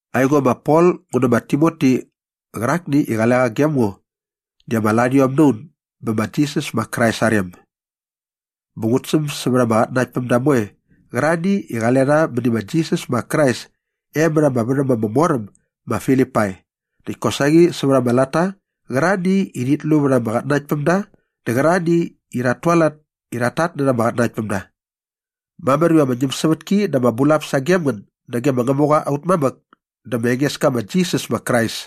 Aingo ma Pol ngu nä ma Timoti qärakni i qale qa gem ngo di ama larhiom na un bä ma Jisas ma Krais aa rem. Bä ngut säm sävät ama qatnanaktpämda moe qärarhani i qale rha mäni ma Jisas ma Krais e mät ama värhäm ama mor äm ma Filipai näkt kosaqi sävät ama latta qärarhani i rhit lu vät ama qatnanaktpämda dä qärarhani i rhat tualat i rhat tatnärha ama qatnanaktpämda. Mamär iva ama ñämsävätki dä ama bulap sagem ngän nage ma Ngämuqa aut mamäk dä ma Engeska ma Jisas ma Krais.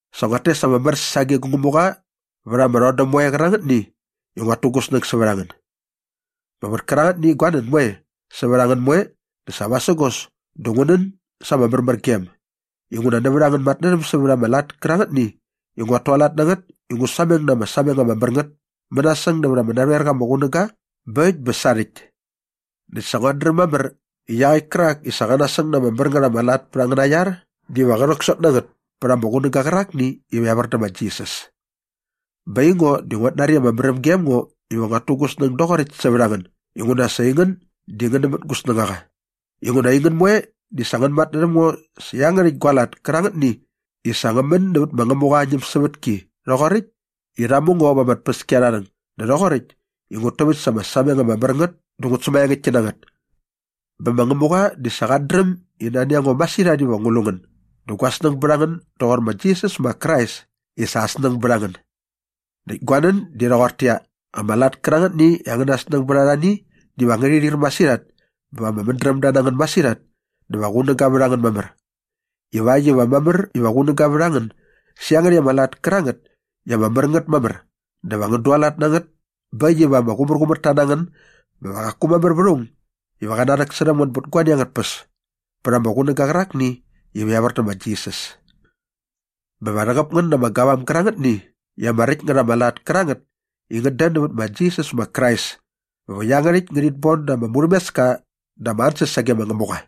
Sa nguat tes ama mär sage gu Ngämuqa vät ama rhodäm moe qärangätni i nguat tu gu snäng sävät a ngän. Bä vät kärangätni gua nän moe sävät a ngän moe dä sa vasägos dä ngu nän sa ama märmärgem inguna nävät angän matnärhäm sävät ama lat kärangätni i nguat tualat na ngät i ngu sameng na ama sameng ama mär ngät mänasäng nävät ama narhoer qa ama qunäga bä äkt bä sarhäkt. Näkt sa nguat dräm mamär i iaqäkt kärak i sa qa nasäng na ama mär ngät ama lat pät angäna iar diva qä rhäksot na ngät pät ama qunäga qärakni iva evär dä ma Jisas. Bä aingo di nguat nari i ama märäm gem ngo iva nguat tu gu snäng doqoräkt sävät a ngän inguna sa aingän di ngän nämät gu snängaqa inguna aingän moe di sa ngän matnärhäm ngo sä iangärhäkt gua lat kärangätni i sa ngä män nävät ma Ngämuqa aa ñämsävätki rhoqoräkt i rha mu ngo va ama tpäskiarharhäng dä rhoqoräkt i ngut täväkt sa ama sameng ama mär ngät dä ngut sämaengäktki na ngät. Bä ma Ngämuqa di sa qat dräm i nani a ngo masirhat iva ngu lu ngän dä gua snäng bät a ngän doqor ma Jisas ma Krais i sa aa snäng bät a ngän. Näkt gua nän di rhoqortäqyia, ama lat kärangätni i angäna snäng bät arhani diva ngärhi rhir masirhat bä va ama mädrämda na ngän masirhat dä va qunäga vät a ngän mamär ivakt iva mamär iva qunäga vät a ngän sä iangärhäkt ama lat kärangät i ama mär ngät mamär dä va ngän dualat na ngät bä äkt iva ama qumärqumärta na ngän bä va qaku mamär vät aung iva qä rhäksärhäm ngän bät guani angät tpäs pät ama qunäga qärakni iva evär dä ma Jisas. Bä va rhäqäp ngän na ama gavam gärangätni i ama räkt ngät ama lat kärangät i ngät dän nävät ma Jisas ma Krais bä va iangärhäkt ngärhit bon da ama murhämeska dä ama ansäs sage ma Ngämuqa.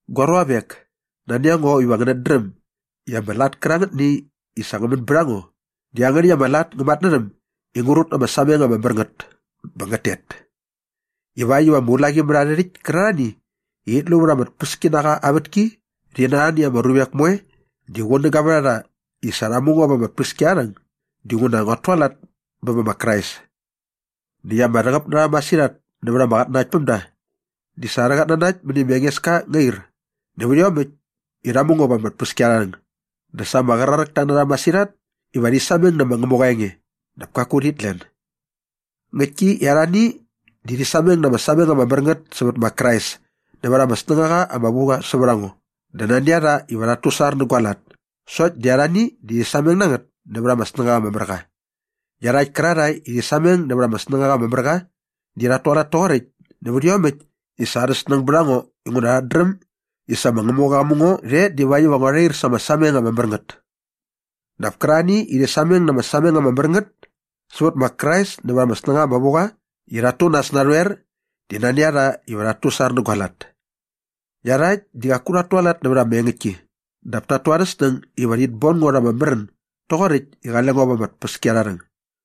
Gua ruavek, nani a ngo iva ngänät dräm i ama lat kärangätni i sa ngä män bät a ngo di iangärhäkt ama lat ngä matnärhäm i ngä rut na ama sameng ama mär ngät bä ngät tet ivakt iva ama ulaqimärharhärhäkt kärarhani i rhit lu vät ama tpäskinaqa aa vätki rhi na arhani ama ruvek moe di qunäga vät a rha i sa rha mu ngo va ama tpäskiarharhäng dinguna nguat tualat bä bä ma Krais. Näkt ama rhäqäp na rha masirhat nävät ama qatnanaktpämda di sa arhä qatnanakt mäni ma Engeska ngä ir nävät iomäkt i rha mu ngo va ama tpäskiarharhäng dä sa ama qraräkta na rha masirhat iva rhi sameng nä ma Ngämuqa aa enge dap kaku rhit len. Ngäktki i arhani di rhi sameng na ama sameng ama mär ngät sävät Krais nävät ama snängaqa ama vu qa sävät a ngo dä nani a rha iva rhat tusar nä gua lat sokt di arhani di rhi sameng na ngät nävät ama snängaqa ama mär qa. Iarhakt kärarhae i rhi sameng nävät ama snängaqa ama mär qa di rhat tualat toqoräkt nävät iomäkt i sa arha snäng bät a ngo inguna rhat dräm i sa ma Ngämuqa qa mu ngo rhe divakt iva ngua rhair särha ama sameng ama mär ngät. Dap kärarhani i rhi sameng na ama sameng ama mär ngät sävät ma Krais nävät ama snängaqa ama vu qa i rhat tu nas narhoer di nani a rha iva rhat tusar nä gua lat. Iarhakt di qaku rhat tualat nävät ama engäktki dap tat tu arhä snäng iva rhit bon ngo rha ama märän doqoräkt i qale ngo va ama tpäskiarharhäng.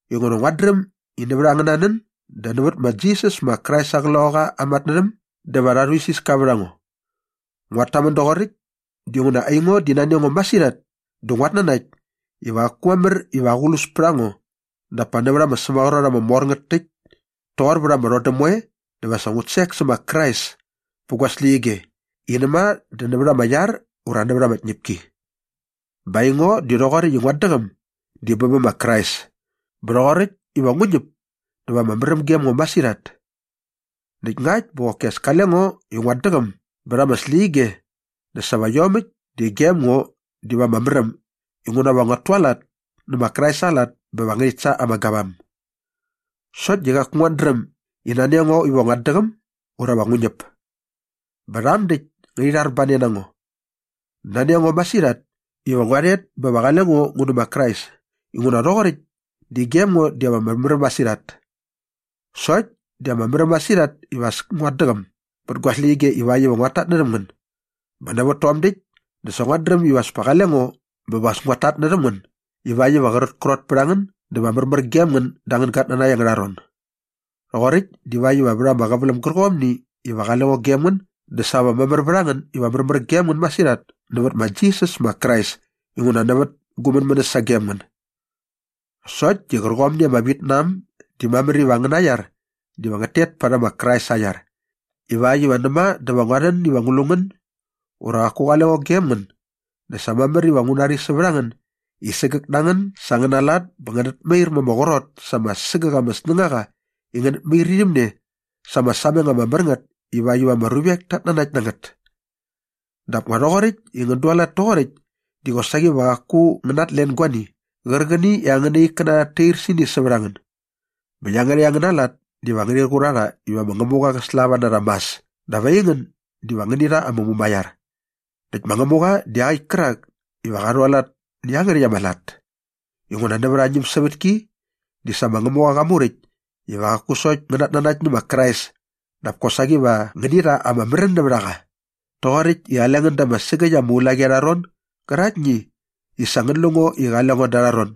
inguna nguat dräm i nävät angäna nän dä nävät ma Jisas ma Krais aa Qloqaqa aa matnärhäm dä va rha rhuisiska vät a ngo. Nguat tamän doqoräkt dinguna aingo di nani a ngo masirhat dä nguat nanakt iva qaku mamär iva aqlus pät a ngo dap pa nävät ama sämaqrot ama mor ngät täkt toqor vät ama rhodäm moe dä sa va ngut sek sä ma Krais pä gu släqyige i näma dä nävät ama iar ura nävät ama tñäpki. Bä aingo di rhoqoräkt i nguat däqäm di bä bä ma Krais bä rhoqoräkt iva ngu ñäp dä va ama märäm gem ngo masirhat. Näkt ngakt bä qoki as kale ngo i nguat däqäm bät ama släqyige dä sa va iomäkt di gem ngo diva ama märäm inguna va nguat tualat nä ma Krais aa lat bä va ngärhit sa ama gavam. Sokt di qaku nguat dräm i nani a ngo iva nguat däqäm ura va ngu ñäp. Bä rham däkt ngärhi rharbane na ngo. Nani a ngo masirhat iva ngua rhet bä va qale ngo ngu nä ma Krais inguna rhoqoräkt di gem ngo diva ama märäm masirhat. Sokt di ama märäm masirhat iva as nguat däqäm bät ama släqyige ivakt iva nguat tatnärhäm ngän. Bä nävät tom däkt dä sa nguat dräm iva as kale ngo bä va as nguat tatnärhäm ngän ivakt iva qrätkrot pät a ngän dä va märmär gem ngän da angän gatnanakt angärha ron. Rhoqoräkt divakt iva vät ama qäväläm gärqomni iva qale ngo gem ngän dä sa va mamär vät a ngän iva märmär gem ngän masirhat nävät ma Jisas ma Krais inguna nävät gu mänmänäs sagem ngän. Sokt di qärqomni i ama vit na äm di mamär iva angäna iar diva ngät tet parhäm ma Krais aa iar ivakt iva näma dä va ngua rhän iva ngu lu ngän ura qaku qale ngo gem ngän dä sa mamär iva ngu nari sävät a ngän i sägäk na ngän sa angäna lat bä ngänät mair ma ama qrot sa ama sägäk ama snängaqa i ngänät mair irhäm ne sa ama sameng ama mär ngät ivakt iva ama ruvek tat nanakt na ngät. Dap nga rhoqoräkt i ngän dualat toqoräkt di qosaqi va qaku ngän natlen guani qärqäni i angäna ikkäna rhat tair sä ini sävät a ngän. Bä iangärhäkt angäna lat diva ngärhi qur a rha iva ma Ngämuqa qä slava na rha mas dap aingän diva ngäni rha ama mumaiar. Näkt ma Ngämuqa di iaqäkt kärak iva qa rhualat nä iangärhäkt ama lat. Inguna nävät aa ñämsävätki di sa ma Ngämuqa qa muräkt iva qaku sokt ngänät nanakt nä ma Krais dap kosaqi va ngäni rha ama märän nävät a qa rhoqoräkt i qale ngän da ama sägäkt ama ulaqi arha ron gäraktni i sa ngän lu ngo i qale ngo da arha ron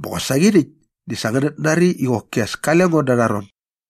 bä qosaqi rhäkt di sa ngänät nari i qoki as kale ngo da arha ron.